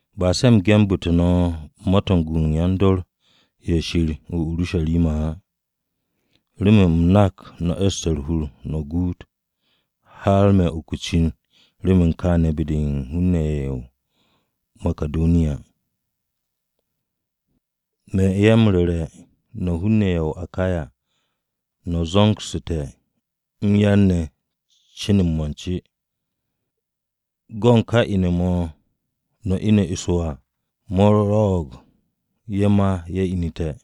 Ba se̱ u̱m gendu̱té̱ no̱ ma-to̱ u̱n gu u̱n yan-dor ye̱ Shir o-Urusharima á. Remen u̱m nak no̱ e̱ste̱ u̱r-hur no̱ guut, har me̱ u̱n uku o-cin remen kaane̱ be-de u̱n hun-ne̱ ye̱ o-Makidoniya. Me̱ ye̱ m-ru̱re̱ no̱ hun-ne̱ ye̱ o-Akaya no̱ zo̱ngsu̱te̱ m-yar ne̱ cin u̱n mo̱nce. Go̱ u̱n ka ine̱-mo̱ no̱ ine̱ eso à, mo̱ rwo̱'o̱g ye̱ ma ye̱ inu̱te̱.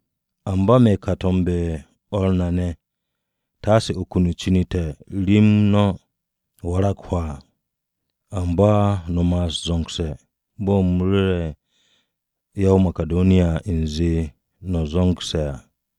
Amba me̱ ka m-to̱mbe̱ u̱n o̱r re ne̱, taase uku cin-o te̱ rem no̱ warag hwaa. Amba no̱ ma'as zo̱ngse̱ bo̱ u̱m ru̱sse̱ ya-o-Makidoniya u̱nze no̱ zo̱ngse̱ à.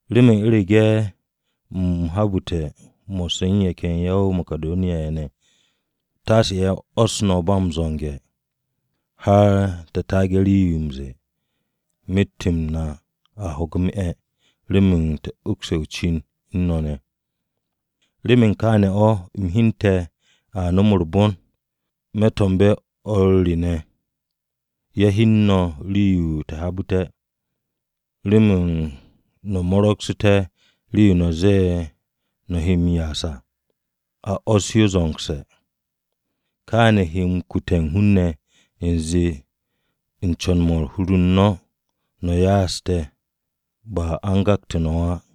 Remen u̱rege̱ u̱m habu̱te̱ mo̱sse̱ u̱n ye̱ ken ya-o-Makidoniya ye̱ ne̱, taase ye̱ 'wo̱s no̱ ba m-zo̱nge̱, har te̱ taage̱ u̱n rii-yo m-ze̱e̱, myet-m na a ho̱ge̱ m-'e̱ remen te̱ ukse̱ o-cin u̱n no̱ ne̱. Remen kaane̱ o̱ u̱m hyente̱ a nom u̱r-bon, me̱ to̱mbe̱ o̱r re ne̱ ye̱ hyen no̱ rii-yo u̱m habu̱te̱, remen no̱ mo̱ro̱gsu̱té̱ rii-yo no̱ ze̱e̱ no̱ he m-ya'as à, a 'wo̱s yo zo̱ngse̱. Kaane̱ he m-kute̱ u̱n hun-ne̱ u̱nze u̱n co̱n-mo̱ u̱n hur-u̱r no̱ o̱, no̱ ya'aste̱, ba a u̱n gakte̱ no̱ o̱ á.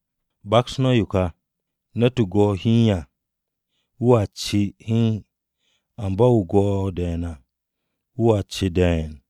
Baks no̱ yo ká: Ne̱t-wu̱ go̱'e̱ hiin à, wu̱a ce hiin; amba wu̱ go̱'e̱ de̱e̱n à wu̱a ce de̱e̱n.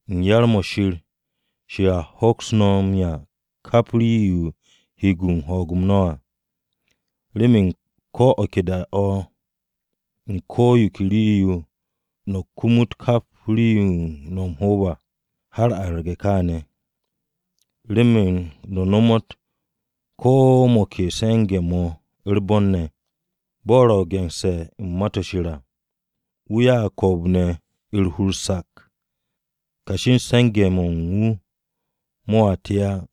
U̱n yar-mo̱ Shir, Shir a hoks no̱ m-'ya kap rii-yo he no̱ m-gu u̱n ho̱o̱g-m no̱ à, remen ko̱ o̱ ke da-o̱ u̱n ko̱ yo ke rii-yo no̱ kumut kap rii-yo no̱ o-hoob à, har arge̱ kaane̱, remen no̱ nomot ko̱ mo̱ ke se̱nge̱-mo̱ u̱r-bon ne̱. Bo̱ ro̱ ge̱nse̱ u̱n Ma-to̱ Shir à: “Wu̱ ya'ag ko̱o̱b-ne̱, u̱r-hur sak. Kashi u̱n se̱nge̱-mo̱ u̱n wu̱ mo̱a te á.”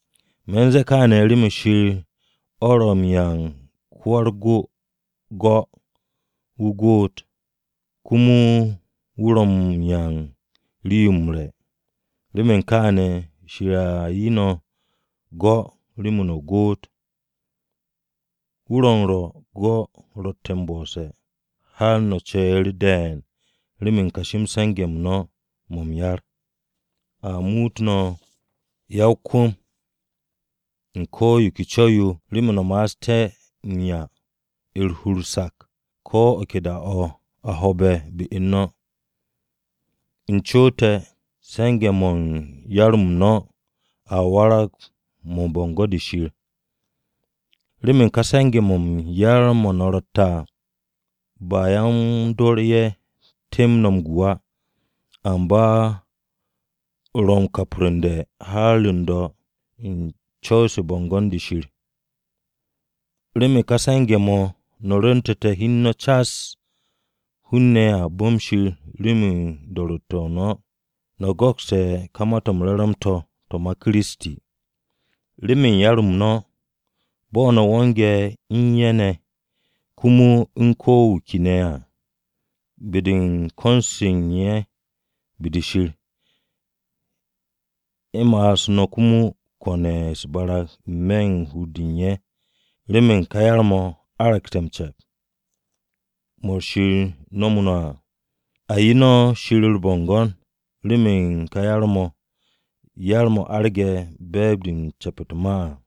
Me̱ u̱n ze̱e̱ kaane̱ remen Shir o̱ ro̱ m-'ya u̱n ko-wa-u̱r-go go̱ wu̱ goot, komo o̱ ro̱ m-'ya u̱n rii-yo m-re̱. Remen kaane̱, Shir a 'ye no̱ go̱ remen no̱ goot, wu̱ ro̱ m-rwo̱ go̱ ro̱tte̱ m-bo̱'o̱sse̱, har no̱ ce̱e̱ru̱ de̱e̱n remen kashi-m se̱nge̱-m no̱ mo̱ m-yar. A muut no̱ ya-o-kwu̱m u̱n ko̱ yo ke co̱w-yo remen no̱ ma'asté̱ m-'ya u̱r-hur sak ko̱ o̱ ke da-o̱ a ho̱o̱be̱ be-u̱r no̱. U̱n co̱w-o te̱ se̱nge̱-mo̱ u̱n yar-m no̱ a warag mo̱ u̱n bo̱ngo̱n-de Shir. Remen ka se̱nge̱-mo̱ m-yar mo̱ no̱tte̱ à, ba yan-dor ye̱ temb no̱ ro̱ m-gu á, amba ro̱ m-kapru̱nde̱ har m-do̱ u̱n co̱w-se u̱r-bo̱ngo̱n be-de Shir. Remen ka se̱nge̱-mo̱ no̱ rwu̱ntu̱te̱ hi u̱n no̱ cas, hun-ne̱ a bu̱m Shir remen do̱ro̱tte̱-o no̱. No̱ go̱kste̱ ka Ma-to̱ m-Re̱re̱m to̱, to̱ ma Kiristi, komo remen yar-m no̱ bo̱ no̱ wo̱nge̱ u̱n ye̱ ne̱ komo u̱n ko̱ wu̱ ke ne̱ à. Be-de u̱n ko̱n-se u̱n ye̱ be-de Shir, ye̱ ma'as no̱ komo m-kone̱ u̱s-barag n-me̱ u̱n hur-de u̱n ye̱ remen ka yar-mo̱ aragte̱ m-ce̱p, mo̱ Shir nomo no̱ à. A 'ye no̱ Shir u̱r-bo̱ngo̱n remen ka yar-mo̱, yar-mo̱ arge̱ be̱e̱b-de u̱n ce̱p u̱t-ma à.